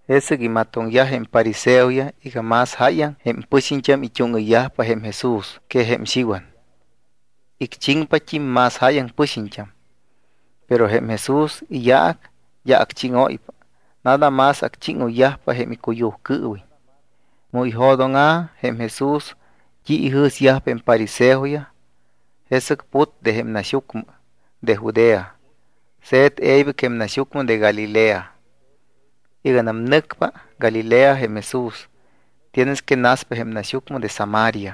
Jesɨc imatoŋyaj jém fariseoyaj iga más jáyaŋ jém pɨxiñt́am it́úŋɨyyajpa jém Jesús que jém Xiwan, icchiŋpat́im más jáyaŋ pɨxiñt́am. Pero jém Jesús iyaac d́a acchíŋóypa, nada más acchíŋoyyajpa jém icuyujcɨɨwiñ. Mu ijo̱dóŋa̱ jém Jesús t́i ijɨ̱syajpa jém fariseoyaj, jesɨc put de jém naxyucmɨ de Judea. Se̱t e̱ybɨc jém naxyucmɨ de Galilea. Iganam nɨcpa Galilea jém Jesús, tienes que naspa jém naxyucmɨ de Samaria.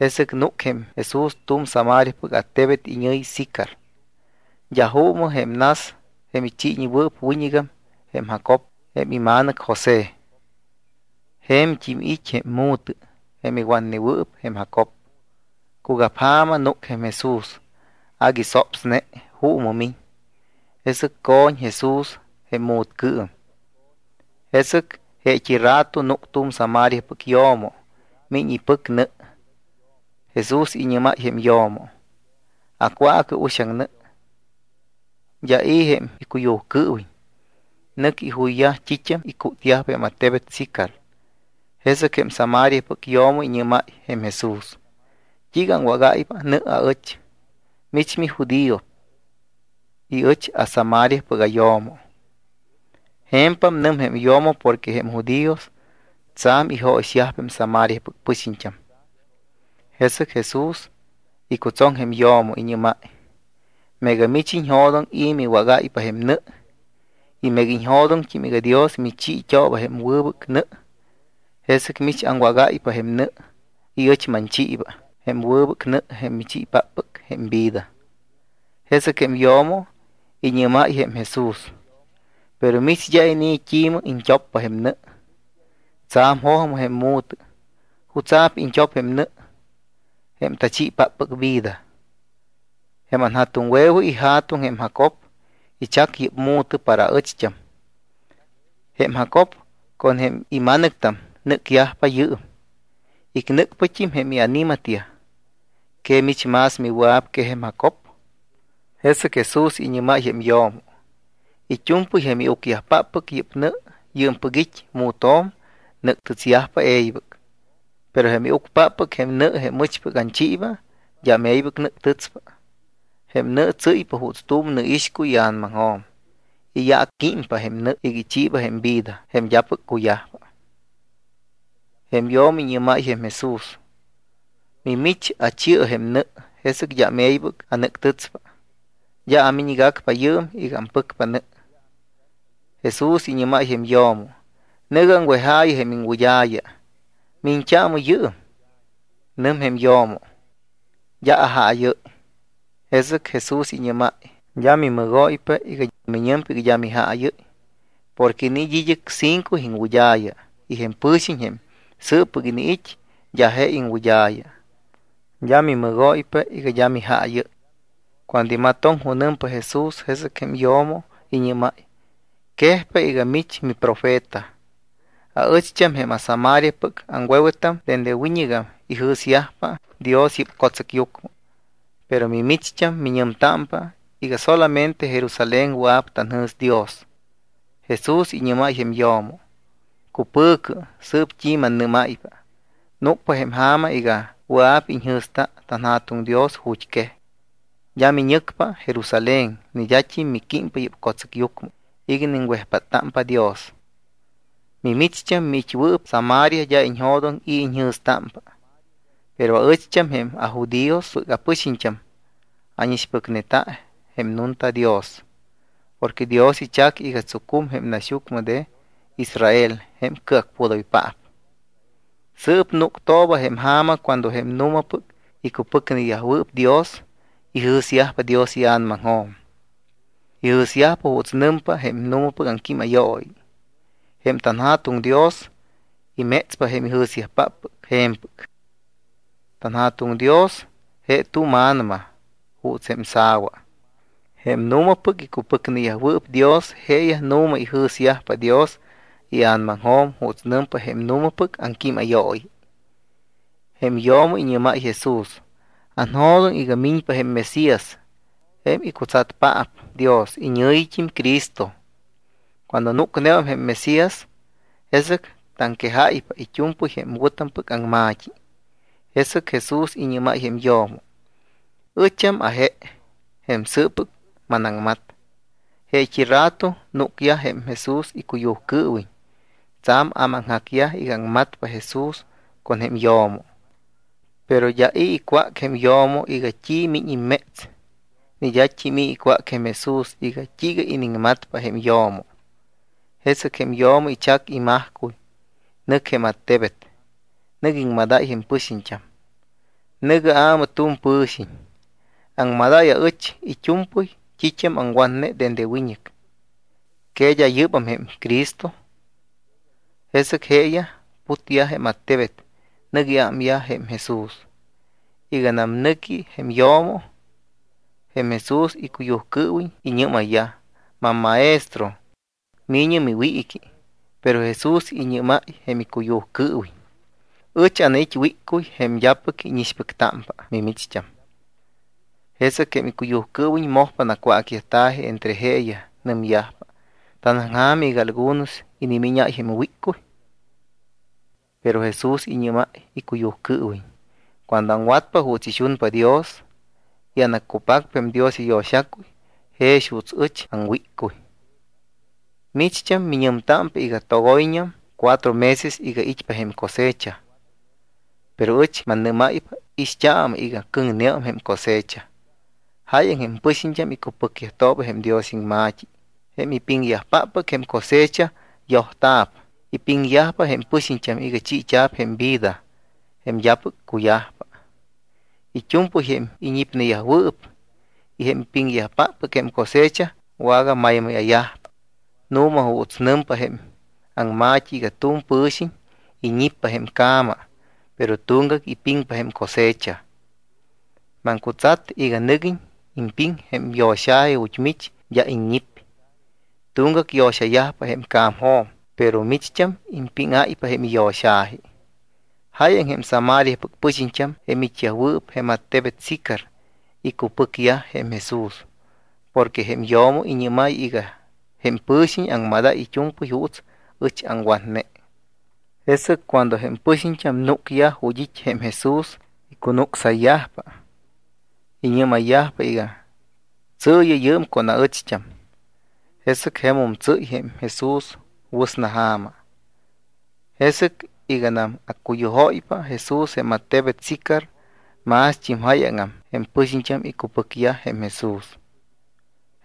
Jesɨc núc jém Jesús tu̱m Samariapɨc attebet iñɨ̱yi Sicar. D́a juumɨ jém nas jém ichiiñewɨɨp wiñɨgam jém Jacob jém ima̱nɨc José. Je̱mt́im it́ jém mu̱tɨ jém iwatnewɨɨp jém Jacob. Cugapja̱ma núc jém Jesús. Agui sopsne. Juumɨ miñ. Jesɨc co̱ñ Jesús jém mu̱tcɨɨm. Jesɨc jeet́i rato núc tu̱m Samariapɨc yo̱mo. Miñ ipɨc nɨ. Jesús iñɨ́máy jém yo̱mo: —Acwaacɨ uxaŋ nɨ. D́a i̱ jém icuyujcɨɨwiñ. Nɨc ijuyyaj t́it́am icútyajpa jém attebet Sicar. Jesɨc jém Samariapɨc yo̱mo iñɨ́máy jém Jesús: —¿T́iiga aŋwágáypa nɨ aɨch? Mich mijudío y ɨch aSamariapɨc ayo̱mo. Je̱mpam nɨm jém yo̱mo porque jém judíos tsa̱m ijóyixyajpa jém Samariapɨc pɨxiñt́am. Jesɨc Jesús icutsoŋ jém yo̱mo. Iñɨ́máy: —Meega mich iñjo̱doŋ i̱ miwágáypa jém nɨ y meega iñjo̱doŋt́im iga Dios michiit́ooba jém wɨbɨc nɨ, jesɨc mich aŋwágáypa jém nɨ y ɨch manchiiba jém wɨbɨc nɨ jém michiipáppɨc jém vida. Jesɨc jém yo̱mo iñɨ́máy jém Jesús: —Pero mich d́a inii̱ t́imɨ iñt́oppa jém nɨ. Tsa̱m jojmɨ jém mu̱tɨ. ¿Jutsa̱p iñt́op jém nɨ jém tachiipáppɨc vida? Jém anja̱tuŋwe̱we ija̱tuŋ jém Jacob ichac yɨ́p mu̱tɨ para aɨcht́am. Jém Jacob con jém ima̱nɨctam nɨ́cyajpa yɨɨm. Icnɨ́cyajpat́im jém iani̱matyaj. ¿Que mich más miwɨa̱p que jém Jacob? Jesɨc Jesús iñɨ́máy jém yo̱mo: —It́u̱mpɨy jém iucyajpáppɨc yɨ́p nɨ, yɨɨmpɨc it́ mu̱tjo̱m, nɨ́ctɨtsyajpa e̱ybɨc. Pero jém iucpáppɨc jém nɨ, jém ɨchpɨc anchiiba, d́am e̱ybɨc nɨ́ctɨtspa. Jém nɨ tsɨ́ypa juuts tu̱m nɨ ixcuy ia̱namaŋjo̱m. Iyaacquímpa jém nɨ iga ichiiba jém vida jém d́apɨc cuyajpa. Jém yo̱mo iñɨ́máy jém Jesús: —Mimich, achi̱ɨ jém nɨ, jesɨc d́am e̱ybɨc anɨ́ctɨtspa. D́a amiñgacpa yɨɨm iga ampɨcpa nɨ. Jesús iñɨ́máy jém yo̱mo: —Nɨ̱gɨ aŋwejaayɨ jém iŋwɨd́a̱ya. Miñt́aamɨ yɨɨm. Nɨm jém yo̱mo: —D́a ajaayɨ́y. Jesɨc Jesús iñɨ́máy: —D́a mimɨgóypa iga miñɨmpa iga d́a mijaayɨ́y. Porque iniit́ id́ɨc cinco iŋwɨd́a̱ya y jém pɨ̱xiñ jém sɨɨppɨc iniit́ d́a je iŋwɨd́a̱ya. D́a mimɨgóypa iga d́a mijaayɨ́y. Cuando imatoŋ junɨmpa Jesús, jesɨc jém yo̱mo iñɨ́máy: —Quejpa iga mich miprofeta. Aɨcht́am jém aSamariapɨc aŋwe̱wetam dende wiñɨgam ijɨ̱syajpa Dios yɨ́p co̱tsɨcyucmɨ. Pero mimicht́am miñɨmtámpa iga solamente Jerusalén wɨa̱p tanjɨ̱sta Dios. Jesús iñɨ́máy jém yo̱mo: —Cupɨ̱cɨ sɨɨp t́i mannɨ́máypa. Núcpa jém ja̱ma iga wɨa̱p iñjɨ̱sta tanJa̱tuŋ Dios ju̱t́quej. D́a miñɨcpa Jerusalén ni d́at́im miquímpa yɨ́p co̱tsɨcyucmɨ iga iniŋwejpáttámpa Dios. Mimicht́am miit́wɨɨp Samaria d́a iñjo̱doŋ i̱ iñjɨ̱stámpa. Pero aɨcht́am jém ajudíospɨc apɨxiñt́am ánixpɨcneta jém nunta Dios porque Dios ichac iga tsucum jém naxyucmɨ de Israel jém cɨacpudoypaap. Sɨɨp núctooba jém ja̱ma cuando jém nu̱mapɨc icupɨcneyajwɨɨp Dios ijɨ̱syajpa Dios ia̱namaŋjo̱m, ijɨ̱syajpa juuts nɨmpa jém nu̱mapɨc aŋquímayooyi. Jém tanJa̱tuŋ Dios imétspa jém ijɨ̱syajpáppɨc je̱mpɨc. TanJa̱tuŋ Dios je tu̱m A̱nama juuts jém sa̱wa. Jém nu̱mapɨc icupɨcneyajwɨɨp Dios jeeyaj nu̱ma ijɨ̱syajpa Dios ia̱namaŋjo̱m juuts nɨmpa jém nu̱mapɨc aŋquímayooyi. Jém yo̱mo iñɨ́máy Jesús: —Anjo̱doŋ iga miñpa jém Mesías jém icutsatpaap Dios, iñɨ̱yit́im Cristo. Cuando núcneum jém Mesías, jesɨc taŋquejáypa it́u̱mpɨy jém wɨ̱tampɨc aŋma̱t́i. Jesɨc Jesús iñɨ́máy jém yo̱mo: —Ɨcham aje, jém sɨɨppɨc manaŋmat. Jeet́i rato núcyaj jém Jesús icuyujcɨɨwiñ. Tsa̱m ámaŋjacyaj iga aŋmatpa Jesús con jém yo̱mo. Pero d́a i̱ icwác jém yo̱mo iga: “¿T́i miñ imméts?” Ni d́at́im i̱ icwác jém Jesús iga: “¿T́iiga iniŋmatpa jém yo̱mo?” Jesɨc jém yo̱mo ichac imajcuy, nɨc jém attebet. Nɨc iŋmadáy jém pɨxiñt́am: —Nɨ̱gɨ aamɨ tu̱m pɨ̱xiñ. Aŋmadáy aɨch it́u̱mpɨy t́it́am aŋwatne dende wiñɨc. ¿Que d́a yɨ́bam jém Cristo? Jesɨc jeeyaj putyaj jém attebet, nɨc iámyaj jém Jesús. Iganam nɨcne jém yo̱mo, jém Jesús icuyujcɨɨwiñ iñɨ́mayyaj: —MamMaestro, mi̱ñɨ miwiiqui. Pero Jesús iñɨ́máy jém icuyujcɨɨwiñ: —Ɨch anait́ wíccuy jém d́apɨc íñixpɨctámpa mimicht́am. Jesɨc jém icuyujcɨɨwiñ mojpa nacwácyajta̱ji entre jeeyaj. Nɨmyajpa: —¿Tanaŋja̱m iga algunos inimíñáy jém wíccuy? Pero Jesús iñɨ́máy icuyujcɨɨwiñ: —Cuando aŋwatpa juuts ixunpa Dios y anaccupacpa jém Dios iyo̱xacuy jex juuts ɨch aŋwíccuy. Micht́am miñɨmtámpa iga: “Togoyñam cuatro meses iga it́pa jém cosecha.” Pero ɨch mannɨ́máypa, ixt́aamɨ iga cɨŋneum jém cosecha. Jáyaŋ jém pɨxiñt́am icupɨcyajtooba jém Dios iŋma̱t́i. Jém ipiŋyajpáppɨc jém cosecha yojyajta̱p. Ipiŋyajpa jém pɨxiñt́am iga chiita̱p jém vida jém d́apɨc cuyajpa. It́u̱mpɨy jém iñipneyajwɨɨp y jém ipiŋyajpáppɨc jém cosecha wagamaymáya̱yajpa. Nu̱ma juuts nɨmpa jém aŋma̱t́i iga tu̱m pɨ̱xiñ iñippa jém ca̱ma, pero tuŋgac ipiŋpa jém cosecha. Maŋcutsat iga nɨguiñ impiŋ jém yo̱xa̱ji ju̱t́ mich d́a iññip. Tuŋgac yo̱xayajpa jém ca̱mjo̱m, pero micht́am impíŋáypa jém iyo̱xa̱ji. Jáyaŋ jém Samariapɨc pɨxiñt́am jém it́yajwɨɨp jém attebet Sicar icupɨcyaj jém Jesús porque jém yo̱mo iñɨ́máy iga: “Jém pɨ̱xiñ aŋmadáy it́u̱mpɨy juuts ɨch aŋwatne.” Jesɨc cuando jém pɨxiñt́am núcyaj ju̱t́ it́ jém Jesús, icunucsayyajpa. Iñɨ́mayyaj iga: “Tsɨɨyɨ yɨɨm con aɨcht́am.” Jesɨc jemum tsɨ́y jém Jesús wɨsna ja̱ma. Jesɨc iganam accuyujóypa Jesús jém attebet Sicar, mást́im jáyaŋam jém pɨxiñt́am icupɨcyaj jém Jesús.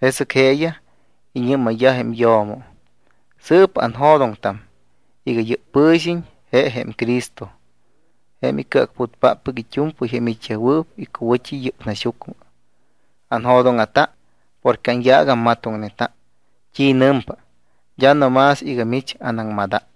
Jesɨc jeeyaj iñɨ́mayyaj jém yo̱mo: —Sɨɨp anjo̱doŋtam iga yɨ́p pɨ̱xiñ je jém Cristo jém icɨacputpáppɨc it́u̱mpɨy jém it́yajwɨɨp icuwɨ̱t́i yɨ́p naxyucmɨ. Anjo̱dóŋa̱ta porque anyaac ammatoŋneta t́i nɨmpa, d́a no más iga mich anaŋmadáy.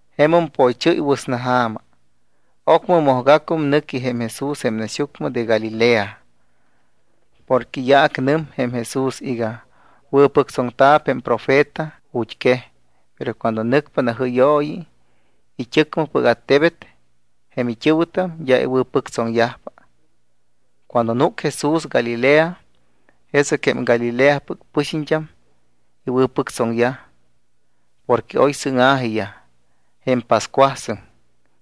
Jemum poychɨ́y wɨsnaja̱ma. Ocmɨ mojgacum nɨqui jém Jesús jém naxyucmɨ de Galilea. Porque iyaac nɨm jém Jesús iga: “Wɨ̱pɨctsoŋta̱p jém profeta ju̱t́quej, pero cuando nɨcpa najɨ́yooyi it́ɨcmɨpɨc attebet, jém it́ɨ̱wɨtam d́a iwɨ̱pɨctsoŋyajpa.” Cuando núc Jesús Galilea, jesɨc jém Galileapɨc pɨxiñt́am iwɨ̱pɨctsoŋyaj. Porque oy sɨŋa̱jiyaj jém pascuasɨŋ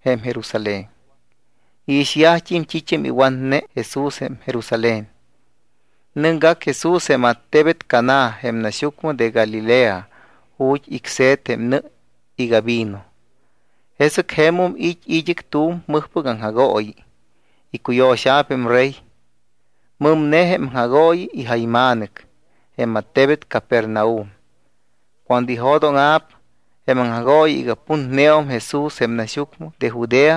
jém Jerusalén. Iixyajt́im t́it́am iwatne Jesús jém Jerusalén. Nɨcgac Jesús jém attebet Caná, jém naxyucmɨ de Galilea, ju̱t́ icse̱t jém nɨ iga vino. Jesɨc jemum it́ id́ɨc tu̱m mɨjpɨc aŋjagooyi, icuyo̱xa̱p jém rey. Mɨmne jém aŋjagooyi ijayma̱nɨc jém attebet Capernaum. Cuando ijo̱dóŋa̱p jém aŋjagooyi iga putneum Jesús jém naxyucmɨ de Judea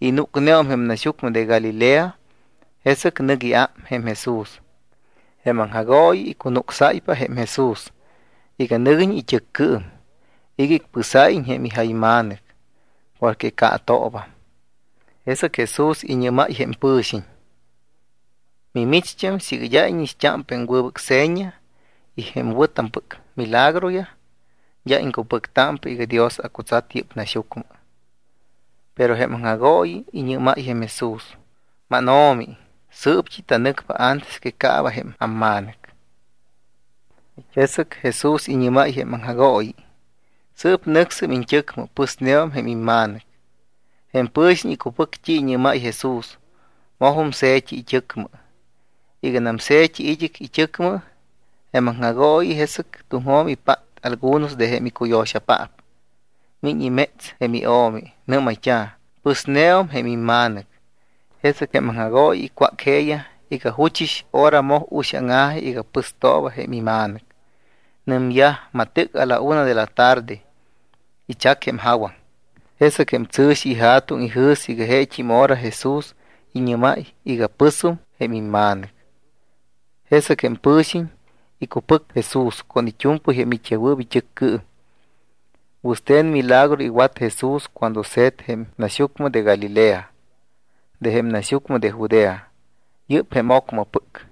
y núcneum jém naxyucmɨ de Galilea, jesɨc nɨc iám jém Jesús. Jém aŋjagooyi icunucsáypa jém Jesús iga nɨguiñ it́ɨccɨɨm iga icpɨsáyiñ jém ijayma̱nɨc porque caatoobam. Jesɨc Jesús iñɨ́máy jém pɨ̱xiñ: —Mimicht́am, siiga d́a íñixt́ámpa jém wɨbɨc seña y jém wɨ̱tampɨc milagroyaj, d́a iŋcupɨctámpa iga Dios acutsat yɨ́p naxyucmɨ. Pero jém aŋjagooyi iñɨ́máy Jesús: —MánO̱mi, sɨɨpt́i tanɨcpa antes que caaba jém amma̱nɨc. Jesɨc Jesús iñɨ́máy jém aŋjagooyi: —Sɨɨp nɨcsɨm iñt́ɨcmɨ. Pɨsneum jém imma̱nɨc. Jém pɨ̱xiñ icupɨc t́i iñɨ́máy Jesús. Mojum se̱t́i it́ɨcmɨ. Iganam se̱t́i id́ɨc it́ɨcmɨ jém aŋjagooyi, jesɨc tuŋjo̱m ipát algunos de jém icuyo̱xayajpaap. Miñ imétsyaj jém io̱mi. Nɨ́mayt́a̱: —Pɨsneum jém imma̱nɨc. Jesɨc jém aŋjagooyi icwác jeeyaj iga juchɨs hora moj uxáŋa̱ji iga pɨstooba jém ima̱nɨc. Nɨmyaj: —Matɨc a la una de la tarde ichac jém jawaŋ. Jesɨc jém tsɨ̱xi ija̱tuŋ ijɨ̱s iga jeet́im hora Jesús iñɨ́máy iga: “Pɨsum jém imma̱nɨc.” Jesɨc jém pɨ̱xiñ icupɨc Jesús con it́u̱mpɨy jém it́yajwɨɨp it́ɨccɨɨm. Wɨste̱n milagro iwat Jesús cuando se̱t jém naxyucmɨ de Galilea de jém naxyucmɨ de Judea. Yɨ́p jém ocmɨpɨc.